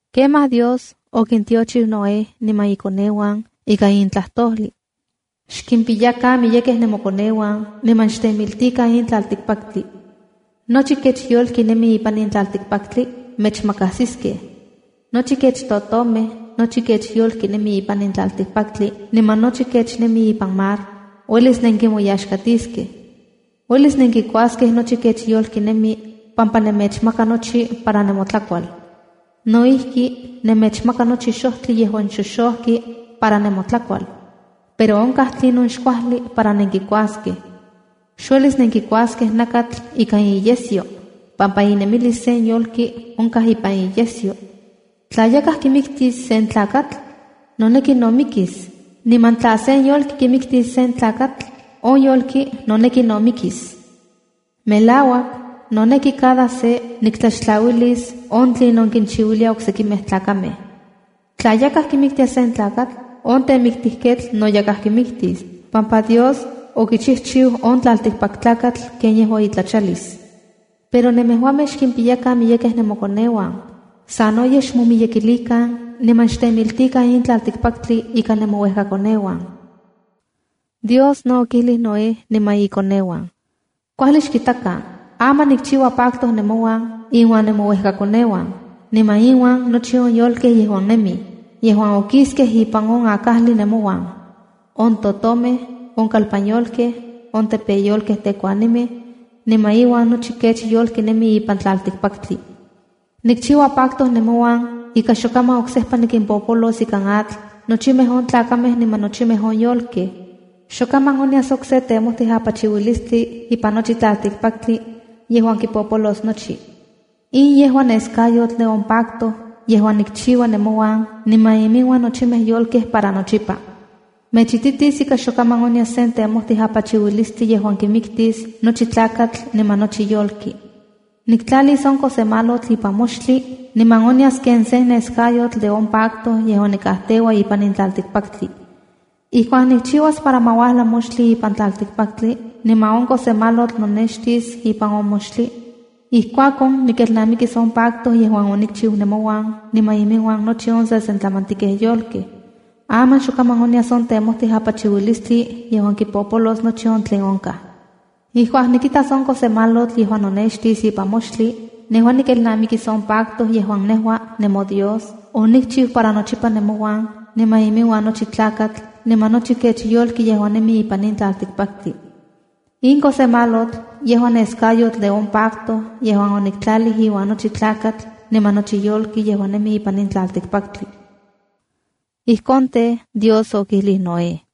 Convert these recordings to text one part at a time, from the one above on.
Kemaj Dios okintiochiu Noé niman ikoneuan ikan in tlajtojlij: “Xkimpiyakan miyekej nemokoneuan, niman xtemiltikan in tlaltikpaktli. Nochi kech yolki nemi ipan in tlaltikpaktli mechmakajsiskej. Nochi kech totomej, nochi kech yolki nemi ipan tlajli niman nochi kech nemi ipan mar, uelis nenkinmoyaxkatiskej. Uelis nenkikuaskej nochi kech yolki nemi pampa nemechmaka nochi para nemotlakual. No ijki, nemechmaka nochi xojtli yejuan xoxojki para nemotlakual. Pero onkaj tlinon xkuajli para nenkinkuaskej. Xuelis nenkikuaskej nakatl ikan iyesyo, pampa inemilis sen yolki onkaj ipan iyesyo. Tla yakaj kimiktis sen tlakatl, noneki no mikis. Niman tla sen yolki kimiktis yakaj tlakatl, on yolki noneki no mikis. Melauak, noneki cada se niktlaxtlaualtis on tlinon kinchiuilia oksekimej tlakamej. ’Tla yakaj kimiktia sen tlakatl, on temiktijketl no yakaj kimiktis, pampa Dios okijchijchiu on tlaltikpak tlakatl ken yejua itlachalis. Pero nemejuamej xkimpiyakan miyekej nemokoneuan. Sanoyej xmomiyekilikan niman xtemiltikan in tlaltikpaktli ikan nemouejkakoneuan.” Dios no okijlij Noé niman ikoneuan: “¡Kuajli xkitakan! Aman nikchiua pacto nemouan inuan nemouekakoneuan, niman inuan nochi on yolkej yejuan nemij, yejuan okiskej ipan on akajli nemouan: On totomej, on kalpan yolkej, on tepeyolkej tekuanimej niman iuan nochi kech yolki nemi ipan tlaltikpaktli. Nikchiua pacto nemouan ika xokaman oksejpa nikimpolos ikan atl nochimej on tlakamej niman nochimej on yolkej. Xok kaman onyas okse temojtij apachiuilistli ipan nochi tlaltikpaktli yejuan kipopolos nochi. In yejua neskayotl de on pacto yejuan nikchiua nemouan niman iminuan nochimej yolkej para nochipa. Mechititis ika xokaman onyas sen temojtij apachiuilistli yejuan kimiktis nochi tlakatl niman nochi yolki. Niktlalis on kosemalotl ipan moxtli niman onyas ken sen neskayotl de on pacto yejuan nikajteua ipan in tlaltikpaktli. Ijkuak nikchiuas para ma uajla moxtli ipan tlaltikpaktli, niman on kosemalotl nonextis ipan on moxtli, ijkuakon nikelnamikis on pacto yejuan onikchiu nemouan niman iminuan nochi on sesentlamantikej yolkej. Aman xokaman onyas on temojtij apachiuilistli yejuan kipolos nochi on tlen onkaj. Ijkuak nikitas on kosemalotl yejuan nonextis ipan moxtli, nejua nikelnamikis on pacto yejuan nejua, nemoDios, onikchiu para nochipa nemouan, niman iminuan nochi tlakatl, niman nochi kech yolki yejuan nemi ipan in tlaltikpaktli. In kosemalotl yejua neskayotl de on pacto yejuan oniktlajli iuan nochi tlakatl niman nochi yolki yejuan nemi ipan in tlaltikpaktli.” Ijkon tej, Dios okijlij Noé.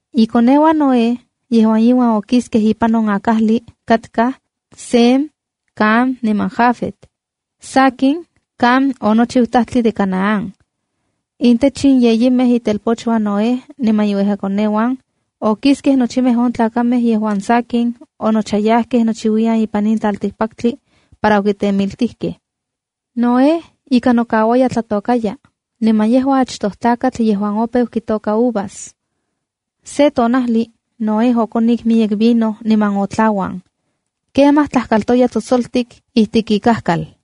Ikoneuan Noé, yejuan iuan okiskej ipan on akajli, katka Sem, Cam niman Jafet. (Sakin, Cam onochiu tajtli de Canaán.) Intech in yeyimej itelpochuan Noé niman inuejkakoneuan, okiskej nochimej on tlakamej yejuan sakin onochayajkej nochiuiyan ipan in tlaltikpaktli para okitemiltijkej. Noé ika nokauaya tlatokaya, niman yejua achtoj tlakatl yejuan opeu kitoka uvas. Se tonajli Noé okonik miyek vino niman otlauan. Kemaj tlajkaltoya tsotsoltik ikalitik ipan ikajkal.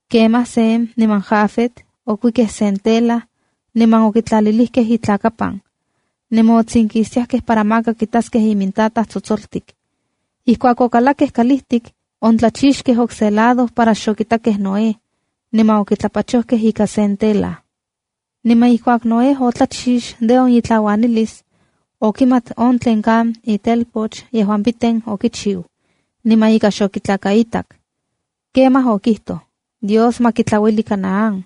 Kemaj Sem niman Jafet okuikej sen tela, niman okinotlalilijkej imintlakapan, niman otsinkistiajkej para maka kitaskej imintataj tsotsoltik. Ijkuak okalakkej kalijtik, otlachixtiajkej okse lado para xokitakej Noé, niman okitlapachojkej ikan sen tela. Niman ijkuak Noé otlachix de on itlauanalis, okimat on tlen Cam itelpoch yejuan piten okichiu, niman ika xokitlakaitak. Kemaj okijtoj: “¡Dios ma kitlaueli Canaán!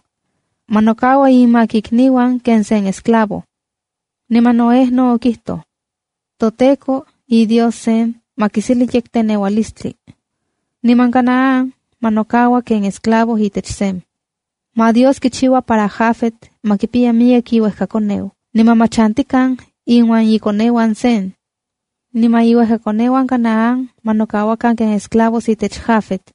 ¡Ma nokaua inmak ikniuan ken se esclavo!” Niman Noé no okijtoj: “ToTEKO, iDios Sem, ma kiseli yekteneualistli. Niman Canaán ma nokaua ken esclavo itech Sem. Ma Dios kichiua para Jafet ma kipiya miyek iuejkakoneu, niman ma chantikan inuan ikoneuan Sem. Niman iuejkakoneuan Canaán ma nokauakan ken esclavos itech Jafet.”